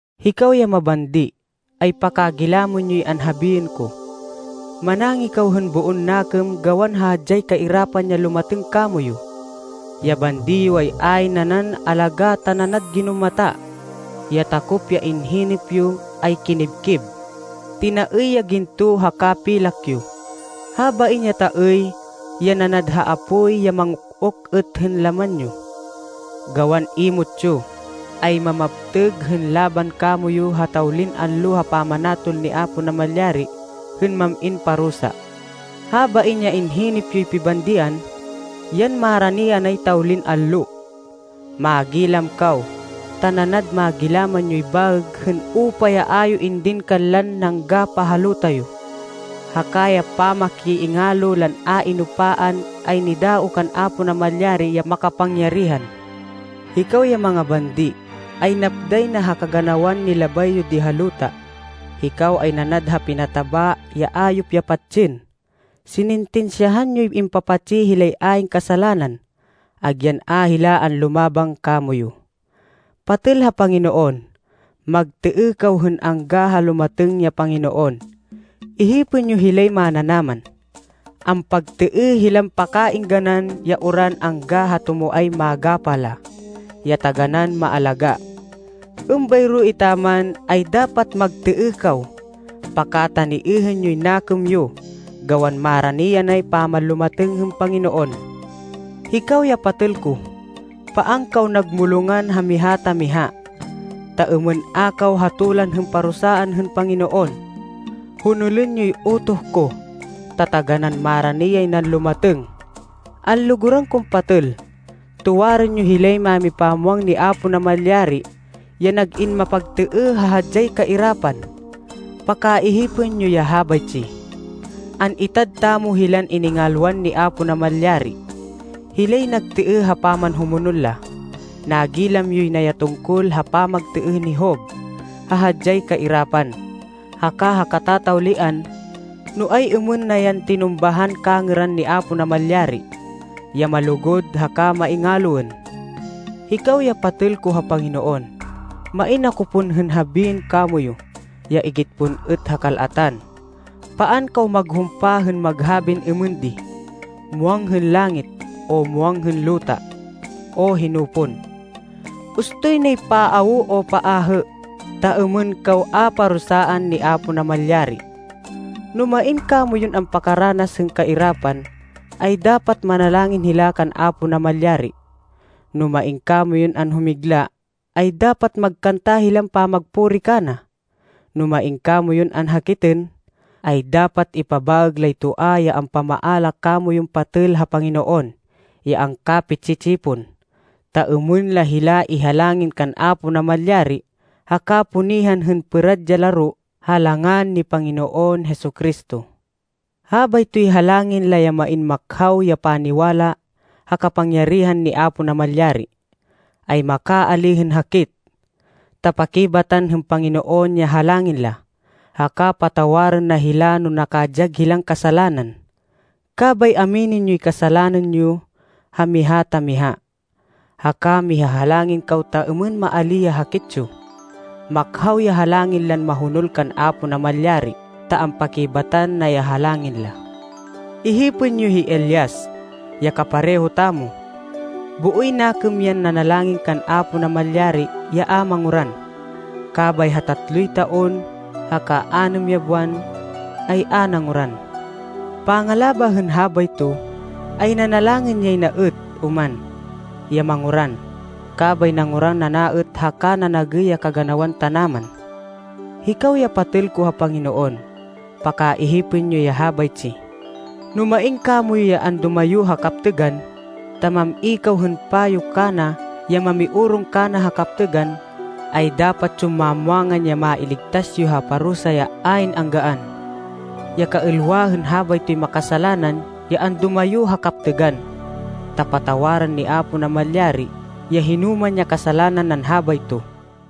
Hikaw ya mabandi, ay pakagilamên yoy anhabiên ko. Manangih kaw hên boon nakêm gawan ha hadyay kairapan ya lumatêng kamoyu. Ya bandi yo ay ayn nanan alagá ta nanad ginumata. Ya takop ya inhinêp yo ay kinibkib. Tinaêy ya ginto haka pilak yo. Habain ya taêy, ya nanad ha apoy ya manguk-uk êt hên laman yo, gawan imot yo, ay mamaptêg hên laban kamoyu ha tawlin allo ha pamanatol ni Apo Namalyari hên mam-in parusa. Habain ya inhinêp yoy pibandian, yan marani anay tawlin allo. Manggilam kaw, ta nanad magilaman yoy baêg hên upa ya a yo indin kanlan nanggapah ha luta yo. Haka ya pamakiingalo lan a inupaan ay nidaoh kan Apo Namalyari ya makapangyarihan. Hikaw ya mangabandi, ay napday na ha kaganawan nilabay yo di ha luta. Hikaw ay nanad ha pinataba ya ayop ya patsên. Sinintinsyahan yon impapatsi hilay ayn kasalanan, agyan a hila anlumaban kamoyu. Patêl ha Panginoon, magtêêh kaw hên angga ha lumatêng ya Panginoon. Ihipên yo hilay mananaman. Ampagtêêh hilan pakaêngganan ya uran angga ha tumoay magapah la, ya taganán maalagá. Êmbayro etaman, ay dapat magtêêh kaw. Pakataniêhên yoy nakêm yo gawan marani yanay pamanlumatêng hên Panginoon. Hikaw ya patêl ko, paan kaw nagmulongan ha miha ta miha, ta êmên a kaw hatolan hên parusaan hên Panginoon. Honolên yoy utoh ko, ta taganán marani yay nan lumatêng! Anlugurên kon patêl, tuwarên yo hilay mámipamwang ni Apo Namalyari ya nag-in mapagtêêh ha hadyay kairapan. Pakaihipên yo ya habaytsi. An-itad tamo hilan iningalwan ni Apo Namalyari, hilay nagtêêh ha pamanhumonol la. Nagilam yoy na ya tungkol ha pamagtêêh ni Job ha hadyay kairapan, haka ha katatawlian, no ay-êmên na yan tinumbahan kangêran ni Apo Namalyari, ya malugud haka maingaloên. Hikaw ya patêl ko ha Panginoon, main ako pon hên habiên kamoyu ya igit pon êt ha kal-atan. Paan kaw maghumpa hên maghabin êmên di, “Muwang hên langit,” o “Muwang hên luta,” o hino pon. Ustoy nay paawo o paahê, ta êmên kaw a parusaan ni Apo Namalyari. No main kamoyun ampakaranas hên kairapan, ay dapat manalangin hila kan Apo Namalyari. No main kamoyun anhumigla, ay dapat magkanta hilan pamagpuri kana. No main kamoyun anhakitên, ay dapat ipabaêg lay toa ya ampamaala kamoyun patêl ha Panginoon ya angkapi-tsi-tsipon. Ta êmên la hila ihalangin kan Apo Namalyari haka punihan hên pêrad ya laro ha langan ni Panginoon Jesu-Cristo. Habaytoy halangin la ya main makhaw ya paniwala ha kapangyarihan ni Apo Namalyari, ay makaalíh hên hakit, ta pakibatan hên Panginoon ya halangin la, haka patawarên na hila no nakadyag hilan kasalanan. Kabay aminên yoy kasalanan yo ha miha ta miha, haka mihahalangin kaw ta êmên maalíh ya hakit yo. Makhaw ya halangin lan mahonol kan Apo Namalyari ta ampakibatan na ya halangin la. Ihipên yo hi Elias, ya kapareho tamo. Booy nakêm yan nanalangin kan Apo Namalyari ya a manguran, kabay ha tatloy taon haka anêm ya buwan, ay a nanguran. Pangalabah hên habayto, ay nanalangin yay na êt oman, ya manguran, kabay nanguran ana êt haka nanagêy ya kaganawan tanaman. Hikaw ya patêl ko ha Panginoon, pakaihipên yo ya habaytsi. No main kamoyu ya andumayo ha kaptêgan, ta mam-i kaw hên payo kana ya mamiorong kana ha kaptêgan, ay dapat yon mamwangan ya mailigtas yo ha parusa ya ayn anggaan, ya kaêlwa hên habaytoy makasalanan ya andumayo ha kaptêgan, ta patawarên ni Apo Namalyari ya hinoman ya kasalanan nan habayto.